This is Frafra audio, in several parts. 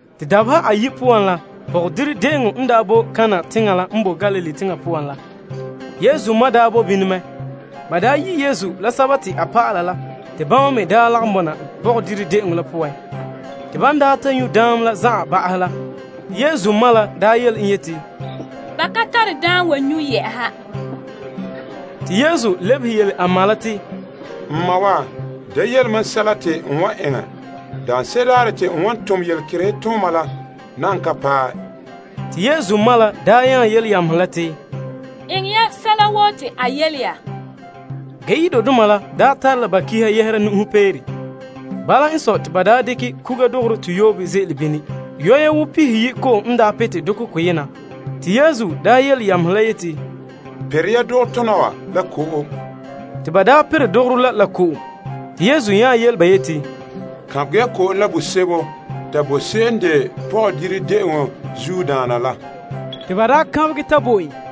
Te dabeha ayi' poan la, pɔgɔdire de'eŋɔ n daa boe Kana teŋa la n boe Galilee teŋa poan la. Yesu ma boe bini mɛ. Ba daa yi' Yesu la a dɔlɔba la te ba lagom bɔna pɔgɔdire de'eŋɔ la poan. Te ban ta nyu' daam la zan'an ba'ahɛ la, Yesu ma la yele en yeti, Ba ka tare daam n wan nyu'. Te Yesu lebehe yele a ma la te, N ma wa, da yele mam sɛla te n wan eŋɛ. Mam saŋa nan ka paɛ. Te Yesu ma la yele yamehe la te, Eŋɛ ya sɛla woo te a yele ya. Yudoma la tare la ba pa'alegɔ yɛhera malema soa. Bala n sɔe, te ba daa dekɛ kuga dogorɔ toyoobe ze'ele bini. Yugulehe pihiyi' bii pihitan' ko'om n daa pete dokɔ koyena. Te Yesu yele yamehe la yeti, Pere ya dogotona wa la ko'om. Te ba daa perɛ dogorɔ la la ko'om. Te Yesu yele ba yeti, Kaanbegɛ ya ko'om la bosebo ta bo se'em n de pɔgɔdire de'eŋɔ zuodaana la. Te ba daa kaanbegɛ ta bo en.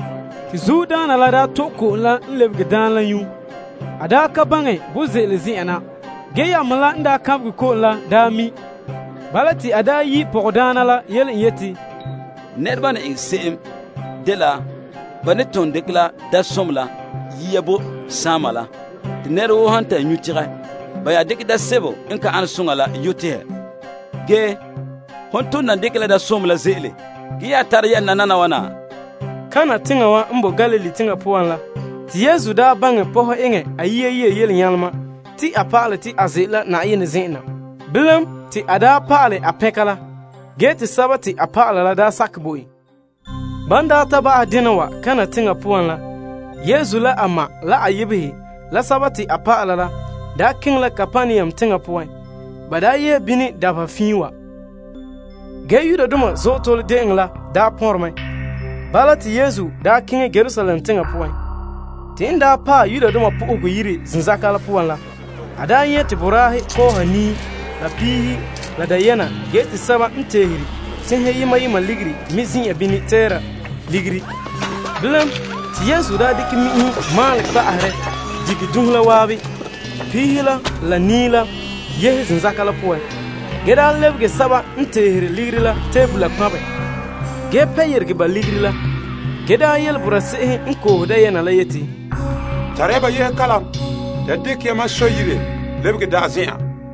Te zuodaana la to'e ko'om la n lebege daam la nyu'. A ka baŋɛ bo ze'ele zen'an na, ge yamehe la n kaanbegɛ ko'om la daa mi'. Bala, te a yi' pɔgɔdaana la yele en yeti, Nɛreba n ne eŋɛ se'em dela ba ne dekɛ la daamsomɔ la yia yo' bo saama la. Te nɛra woo han ta nyu' tegɛ, ba nya dekɛ daam sebo n ka ane soŋa la yo' tehɛ. Ge, hon ton nan dekɛ ne la daamsomɔ la ze'ele ge tara tara la wana ma'an. Kana teŋa wa n boe Galilee teŋa poan la te Yesu daa pɔhɛ eŋɛ a yia yelenyalema ta pa'alɛ te a ze'ele la Yenɛ zen'en na. Bilam, te a pa'alɛ a pɛnka la, ge te a dɔlɔba la sakɛ bo en. Ban daa ta ba'ahɛ dena wa Kana teŋa poan la, Yesu la a ma, la a yebehe, la a dɔlɔba la, daa keŋɛ la Kapernaum teŋa poan. Ba daa yee bini dabeha fiin wa. Ge Yudoma Azootole De'eŋɔ la daa pɔnre mɛ. Bala te Yesu keŋɛ Yerusalem teŋa poan. Te n paɛ Yenɛ Yire zenzaka la poan la, a nyɛ' te boraahe kɔɔha nii la piihe la dayɛna ge te sɛba me zin'an bini tɛɛra ligiri. Bilam, te Yesu dekɛ mi'inhe maalɛ kpa'aherɛ dige dunhe la zan'an. Piihe la, la nii la yehe zenzaka la poan, ge lebege sɛba n teere ligiri la tebola kpanbɛ ge pɛ ba ligiri la yeregɛ, ge yele boraa se'ehe n koohe dayɛna la yeti, Tare ya ba yehe kalam. Da dekɛ ya mam Sɔ yire lebege da'a.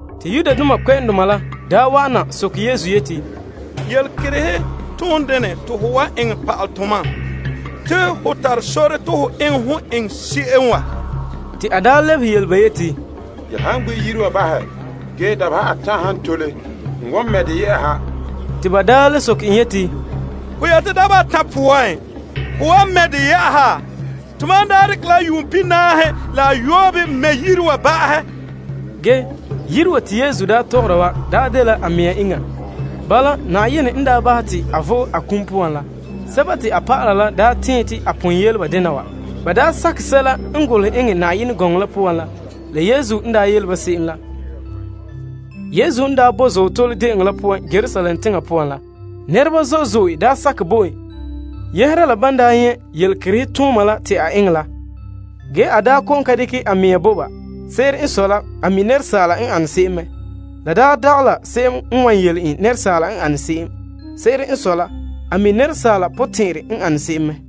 Te Yudoma la wa'ana soke Yesu yeti, Yelekerehe toon dene te ho wan eŋɛ pa'alɛ tomam te ho tare sore te ho eŋɛ hon eŋɛ se'em wa? Te a lebehe yele ba yeti, Ya han gbi' Yire wa bahɛ ge dabeha atan' han tole, n wan mɛ' de yɛ'ɛha. Te ba le soke en yeti, Ho yeti dabeha atan' poan, hon wan mɛ' de yɛ'ɛha? Ba dekɛ la yuun pihinaahe la ayoobe mɛ' Yenɛ Yire wa ba'ahɛ. Ge, Yire wa te Yesu daa tɔgɔra wa dela a mɛŋa iŋa. Bala, Yenɛ n bahɛ te a vo'e a kum poan la, a dɔlɔba la tɛɛn te a pon yele dena wa. Ba sakɛ sɛla n golehɛ eŋɛ Yenɛ gɔŋɔ la poan la, la Yesu n yele se'em la. Yesu n daa boe Azootole De'eŋɔ la poan Yerusalem teŋa poan la, nɛreba zo'e zo'e sakɛ bo en yɛhera la ban nyɛ' yelekerehe tooma la te a eŋɛ la. Ge, a kɔ'ɔn ka dekɛ a mɛŋa delom ba. Se'ere n sɔe la, a mi' asaala n ane se'em mɛ. La dagɛ la se'em n wan yele en asaala n ane se'em. Se'ere n sɔe la, a mi' asaala potɛn'ɛrɛ n ane se'em mɛ.